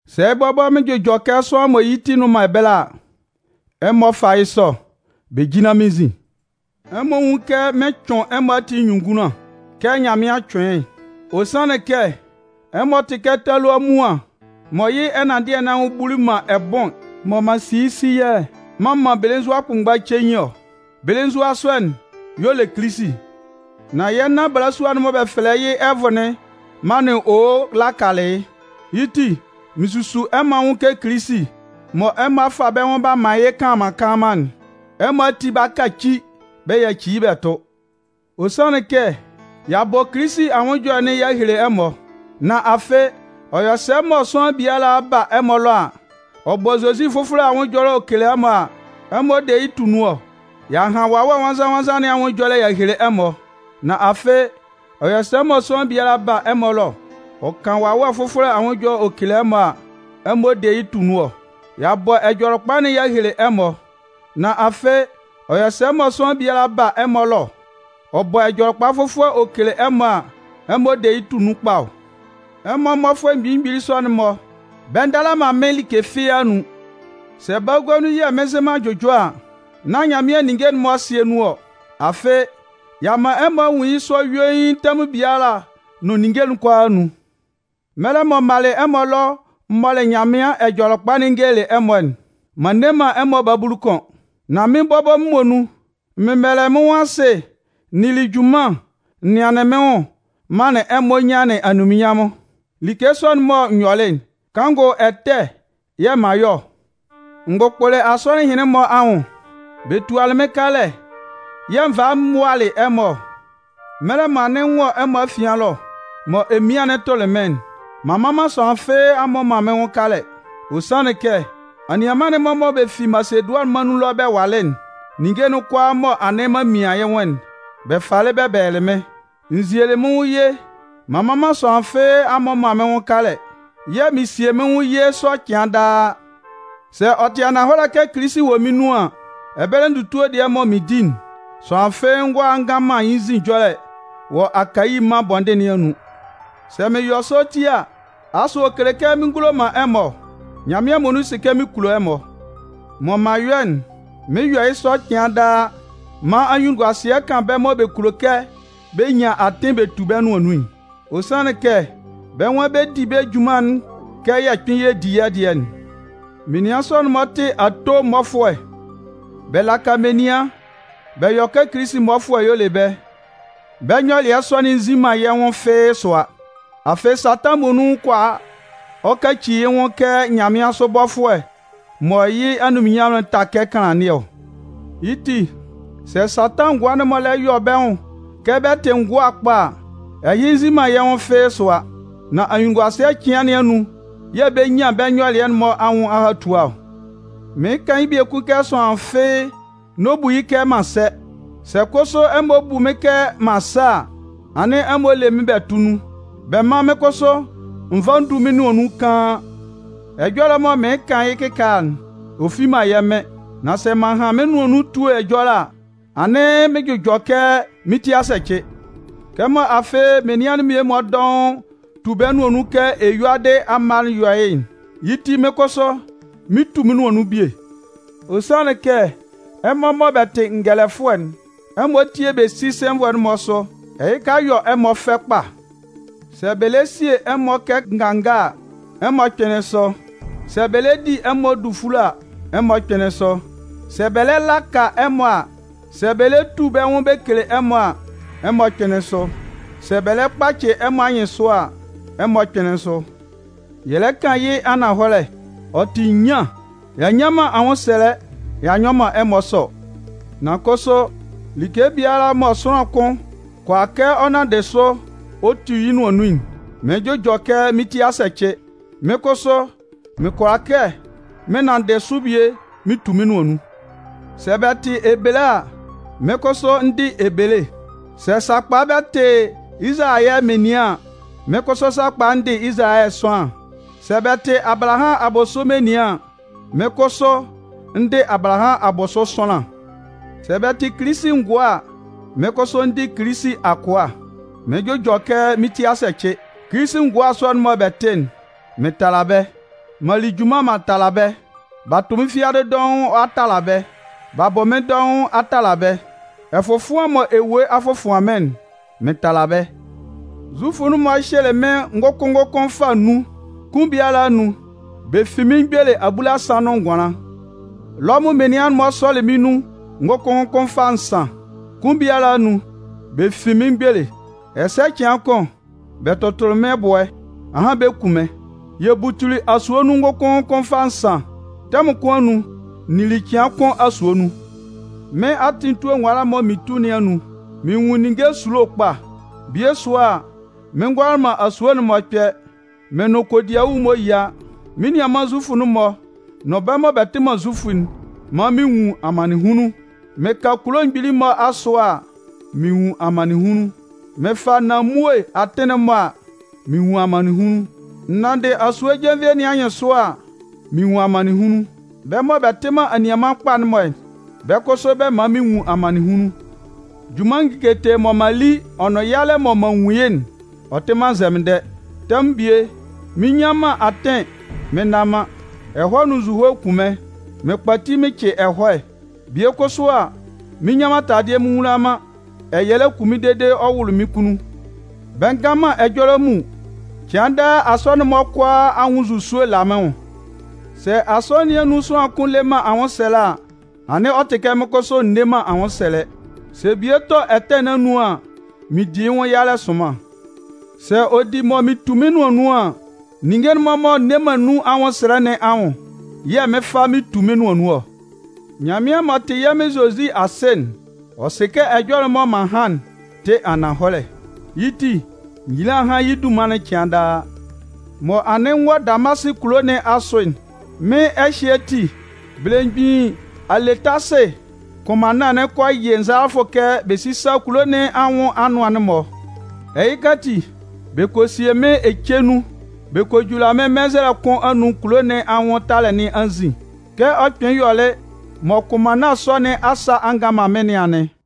Sɛ bɔbɔ mɩn jʋjɔ kɛ sʋanlan mɔ yɩ́ ti nnʋn man ɛbɛlɛ a, ɛmɔ fá yɩ́ sɔ, bɛ jínlan mɩ́n nzin! Ɛmɔ nwún yɩ́ kɛ mɩn cʋɩn ɛmɔ ati nyunnunngunlan kɛ Nyanmɩan cʋɩn yɩ́'n. Ɔ sanlɩn kɛ ɛmɔ tɩ kɛ talua muan mɔ yɩ́ ɛnanndɩɛ nɩn anwʋn buli man ɛbʋɩn mɔ m'an si yɩ́ siyɛlɛ m'an man belenzua kʋnmgba cein ɔ. Belenzua sɔ'n y'ɔ le Kilisi. Nan yɛ́ nan balasua'n mɔ bɛ fɛlɛ yɩ́ Ɛvʋ'n manlɩn owo'n lakalɩ yɩ́. Yɩ́ ti, mɩn susu ɛmɔ anwʋn kɛ Kilisi mɔ ɛmɔ a fa bɛ́ nwʋn b'a man yɩ́ kanlanman kanlanman'n, ɛmɔ ati 'ba kaci bɛ yaci yɩ́ bɛ tʋ. Ɔ sanlɩn kɛ y'a bɔ Kilisi anwʋn ɛjɔlɛ'n y'a hele ɛmɔ. Nan afɩ, ɔ yɔ sɛ mɔ sʋanlan biala ba ɛmɔ ɛlɔ, ɔ bɔ Zozi fʋfɔlɛ anwʋn ɛjɔlɛ ɔ kele ɛmɔ a, ɛmɔ de yɩ́ tʋ nun ɔ? Y'a han Wawɛ Nwannzan-nwannzan nɩn anwʋn ɛjɔlɛ'n y'a hele ɛmɔ. Nan afɩ, ɔ yɔ sɛ mɔ sʋanlan biala ba ɛmɔ ɛlɔ ɔ kan wawɛ fʋfɔlɛ anwʋn ɛjɔlɛ ɔ kele ɛmɔ a, ɛmɔ de yɩ́ tʋ nun ɔ? Y'a bɔ Ɛjɔlɛkpa'n y'a hele ɛmɔ. Nan afɩ, ɔ yɔ sɛ mɔ sʋanlan biala ba ɛmɔ ɛlɔ, ɔ bɔ ɛjɔlɛkpa fʋfɔlɛ ɔ kele ɛmɔ a, ɛmɔ de yɩ́ tʋ nun kpa ɔ? Ɛmɔ mmɔfʋɛ mgbili mgbili sɔ'n-mɔ, bɛ ndala man mɩ́n like fɩ́ɩ́ anun. Sɛ bagua nun yɛ̂ mɩn nzɩ man jʋjɔ a, nán Nyanmɩan ninnge'n-mɔ ɛsɩɛ nun ɔ. Afɩ, y'a man ɛmɔ a nwun yɩ́ sɔ yuein tɛmʋn biala nʋn ninnge kʋalaa anun. Mɛlɛ mɔ m malɩ ɛmɔ ɛlɔ m mɔlɩ Nyanmɩan Ɛjɔlɛkpa'n n gelelɩ ɛmɔ'n, m'an nne man ɛmɔ babulu kʋn. Nan mɩ́n bɔbɔ muonun, m mɛbɛlɛlɩ mɩ́n nwʋn asɩ n nili junman n nɩanlɩn mɩ́n nwʋn manlɩn ɛmɔ nyanlɩn anunminnyanmʋn. Like sɔ'n mɔ n yɔlɩ'n, kanngʋ ɛtɛ yɛ̂ m'an yɔ ɔ? N gbʋkpʋlɩ asɔnɩn ɛhɩnlɩn-mɔ anwʋn, bɛ tualɩ mɩ́n kalɛ yɛ̂ n valɩ m mʋalɩ ɛmɔ ɔ. Mɛlɛ mɔ anɩn n wɔ ɛmɔ afian ɛlɔ mɔ emian'n tʋlɩ mɩ́n'n, m'an man sʋanlan fɩ́ɩ́ a mmɔ man mɩ́n nwʋn kalɛ. Ɔ sanlɩn kɛ anianman'n-mɔ mɔ bɛ fi Masedʋanɩn mân nun ɛlɔ bɛ walɩ'n, ninnge'n kʋalaa mɔ anɩn m'an mian yɩ́ nwʋn'n, bɛ falɩ bɛ bɛlɛlɩ mɩ́n. N zielɩ mɩ́n nwʋn ye, m'an man sʋanlan fɩ́ɩ́ a mmɔ man mɩ́n nwʋn kalɛ. Yɛ̂ mɩn 'sie mɩ́n nwʋn ye sɔ cɩan daa. Sɛ ɔ tɩ ananhɔlɛ kɛ Kilisi wɔ mɩ́n nun an, ɛbɛlɛ ndutue dɩɛ mɔ mɩn di'n, sʋanlan fɩ́ɩ́ ngʋala ngan man yɩ́ nzin ɛjɔlɛ wɔ Akayi mân bɔndɩn nɩn anun. Mɩn yɔ sɔ ti a, asʋ ɔ kele kɛ mɩn ngulo man ɛmɔ ɔ? Nyanmɩan muonun sɩ kɛ mɩn kulo ɛmɔ. Mɔ m'an yɔ'n, mɩn 'yɔ yɩ́ sɔ cɩan daa man anyunnunguasɩɛ kan bɛ́ mɔ bɛ kulo kɛ bɛ nyan atɩn bɛ tu bɛ́ nʋan nun'n. Ɔ sanlɩn kɛ bɛ́ nwan bɛ di bɛ́ junman'n kɛ yɛ kpɩn yɛ di yɛ́ dɩɛ'n. Menian sɔ'n-mɔ tɩ ato mmɔfʋɛ. Bɛ laka menian bɛ yɔ kɛ Kilisi mmɔfʋɛ y'ɔ le bɛ́. Bɛ́ nyɔlɩɛ sɔ'n nzin man yɛ́ nwʋn fɩ́ɩ́ sʋa. Afɩ, Satan muonun kʋala ɔ kaci yɩ́ nwʋn kɛ nyanmɩansʋ bɔfʋɛ mɔ yɩ́ anunminnyanmʋn'n ta kɛ kanlannɩɛ ɔ. Yɩ́ ti, sɛ Satan ngʋa'n-mɔ lɛ yɔ bɛ́ nwʋn kɛ bɛ tɩ ngʋa kpa a, ɛhɩ nzin man yɛ́ nwʋn fɩ́ɩ́ sʋa. Nan ayuelɩɛ cɩan nɩn anun yɛ̂ bɛ 'nyan bɛ́ nyɔlɩɛ'n-mɔ anwʋn ahatua ɔ. Mɩɩn kan yɩ́ biekun kɛ sʋanlan fɩ́ɩ́ n'ɔ bu yɩ́ kɛ m'an sɛ. Sɛ kʋsʋ ɛmɔ bu mɩ́n kɛ m'an sɛ a, anɩn ɛmɔ lé mɩ́n bɛ tʋ́ nun, bɛ mán mɩ́n kʋsʋ n vá n dú mɩ́n nʋan nun kaan. Ɛjɔlɛ mɔ mɩɩn kan yɩ́ kɩkaala'n, ɔ fi man yɛ́ Mɩn. Nan sɛ m'an han mɩ́n nʋan nun etue ɛjɔlɛ a, anɩn mɩɩn jʋjɔ kɛ mɩ́n ti a sɛcɩ. Kɛmɔ afɩ menian mmie-mɔ dɔʋn tu bɛ́ nʋan nun kɛ eyuadɩ amma yɔ yɩ́'n, yɩ́ ti mɩ́n kʋsʋ, mɩn 'tu mɩ́n nʋan nun bie. Ɔ sanlɩn kɛ ɛmɔ mɔ bɛ tɩ ngɛlɛfʋɛ'n, ɛmɔ tie bɛ si sɛnvʋɛ'n-mɔ sʋ, ɛhɩka yɔ ɛmɔ fɛ kpa. Sɛ bɛ lɛ sie ɛmɔ kɛ nganga a, ɛmɔ kpɩnlɩn sʋ, sɛ bɛ lɛ di ɛmɔ dufule a, ɛmɔ kpɩnlɩn sʋ, sɛ bɛ lɛ laka ɛmɔ a, sɛ bɛ lɛ tu bɛ́ nwʋn bɛ kele ɛmɔ a, ɛmɔ kpɩnlɩn sʋ, sɛ bɛ lɛ kpacɩ ɛmɔ anyɩnsʋ a, ɛmɔ kpɩnlɩn sʋ. Yɛ lɛ kan yɩ́ ananhɔlɛ, ɔ tɩ nyian. Y'a nnyan man anwʋnsɛlɛ y'a nyɔ man ɛmɔ sɔ. Nan kʋsʋ like biala mɔ sʋanlan kʋn kʋala kɛ ɔ nanndɩ sʋ ɔ tu yɩ́ nʋan nun'n, mɩɩn jʋjɔ kɛ mɩ́n ti a sɛcɩ, mɩ́n kʋsʋ mɩn kʋala kɛ mɩn nanndɩ sʋ bie mɩn tu mɩ́n nʋan nun. Sɛ bɛ tɩ Ebele a, mɩ́n kʋsʋ, n dɩ Ebele. Sɛ sakpa bɛ tɩ Izalayɛ menian an, mɩ́n kʋsʋ, sakpa n dɩ Izalayɛ sʋanlan. Sɛ bɛ tɩ Abalahamʋn abʋsʋ menian an, mɩ́n kʋsʋ, n dɩ Abalahamʋn abʋsʋ sʋanlan. Sɛ bɛ tɩ Kilisi ngʋa a, mɩ́n kʋsʋ, n dɩ Kilisi akʋa. Mɩɩn jʋjɔ kɛ mɩ́n tɩ a sɛcɩ. Kilisi ngʋa sɔ'n mɔ bɛ tɩ'n, mɩn tala bɛ́. M'an li junman m'an tala bɛ́. B'a tʋ mɩ́n fiadɩ dɔʋn a tala bɛ́. B'a bʋ mɩ́n dɔʋn a tala bɛ́. Ɛfɔfʋan mɔ ewue a fɔfʋan mɩ́n'n, mɩn tala bɛ́. Zufʋ'n-mɔ hyɩlɩ mɩ́n ngʋkʋn ngʋkʋn fâ nnun. Kʋn biala anun, bɛ fin mɩ́n mgbele abulasan nʋn ngʋanlan. Lɔmʋn menian'n-mɔ sɔlɩ mɩ́n nun ngʋkʋn ngʋkʋn fâ nsan. Kʋn biala anun, bɛ fin mɩ́n mgbele. Ɛsɛ cɩan kʋn, bɛ tʋtʋlɩ mɩ́n ɛbʋɛ, ahan bɛ kun mɩ́n. Yɛ butuli asue nun ngʋkʋn ngʋkʋn fâ nsan. Tɛmʋn kʋn anun, n nili cɩan kʋn asue nun. Mɩ́n atɩn etue nwala'n mɔ mɩn tu nɩn anun, mɩn nwun ninnge esulo kpa. Bie sʋa, mɩn ngʋala man asue'n-mɔ kpɛ, mɩn nʋn kodiawu-mɔ yia, mɩ́n nianman Zufʋ'n-mɔ nʋn bɛ́ mɔ bɛ tɩ man Zufʋ'n man mɩn nwun amannɩnhunlun. Mɩn ka kulo mgbili'n-mɔ asʋ a, mɩn nwun amannɩnhunlun. Mɩn fa nanmue atɩn'n-mɔ a, mɩn nwun amannɩnhunlun. N nanndɩ asue jenvie nɩn anyɩnsʋ a, mɩn nwun amannɩnhunlun. Bɛ́ mɔ bɛ tɩ man anianman kpa'n-mɔ, bɛ́ kʋsʋ, bɛ man mɩn nwun amannɩnhunlun. Junman ngiketee mɔ m'an li ɔ nʋn yalɛ mɔ m'an nwun yɩ́'n, ɔ tɩ man nzɛmɩndɛ. Tɛmʋn bie, mɩn nnyan man atɩn mɩn nna man, ɛhɔɛ nʋn nzuhoe kun mɩ́n, mɩn kpati mɩn cɩ ɛhɔɛ. Bie kʋsʋ a, mɩn nnyan man taladɩɛ mɩn nwula man, ɛyɛlɛ kun mɩ́n dede ɔ wʋlʋ mɩ́n kunnun. Bɛ ngan man ɛjɔlɛ mun. Cɩan daa, asɔnɩn'n-mɔ kʋalaa anwʋn nzusue la mɩ́n nwʋn. Sɛ asɔnɩn nɩn anun sʋanlan kʋn le man anwʋnsɛlɛ a, anɩn ɔ tɩ kɛ mɩ́n kʋsʋ, n nne man anwʋnsɛlɛ. Sɛ bie tɔ ɛtɛ nɩn anun an, mɩn di yɩ́ nwʋn yalɛ sʋnman. Sɛ ɔ di mɔ mɩn tu mɩ́n nʋan nun an, ninnge'n-mɔ mɔ n nne man nun anwʋnsɛlɛ nɩn anwʋn yɛ̂ mɩn 'fa mɩn 'tu mɩ́n nʋan nun ɔ. Nyanmɩan m'ɔ tɩ yɛ́ Mɩn Zozi Asɩ'n, ɔ sɩ kɛ ɛjɔlɛ'n mɔ m'an han'n tɩ ananhɔlɛ. Yɩ́ ti, nyila hán yɩ́ dunman'n cɩan daa! Mɔ anɩn n wɔ Damasɩ kulo nɩn asʋ'n, mɩ́n ɛhyɩɛ ati, belemgbin Aletasɩ kʋnmanna'n kɔ yɩ nzalafʋ kɛ bɛ sísa kulo nɩn anwʋn anʋan'n-mɔ. Ɛhɩ ati, bɛ kɔ sie mɩ́n ece nun, bɛ kɔ jula mɩ́n mɛnzɛlɛ kʋn anun kulo nɩn anwʋn talɛ nɩn anzin. Kɛ ɔ kpɩnlɩn yɔlɩ mɔ kʋnmanna sɔ nɩn asa a ngan man mɩ́n nɩn anɩn.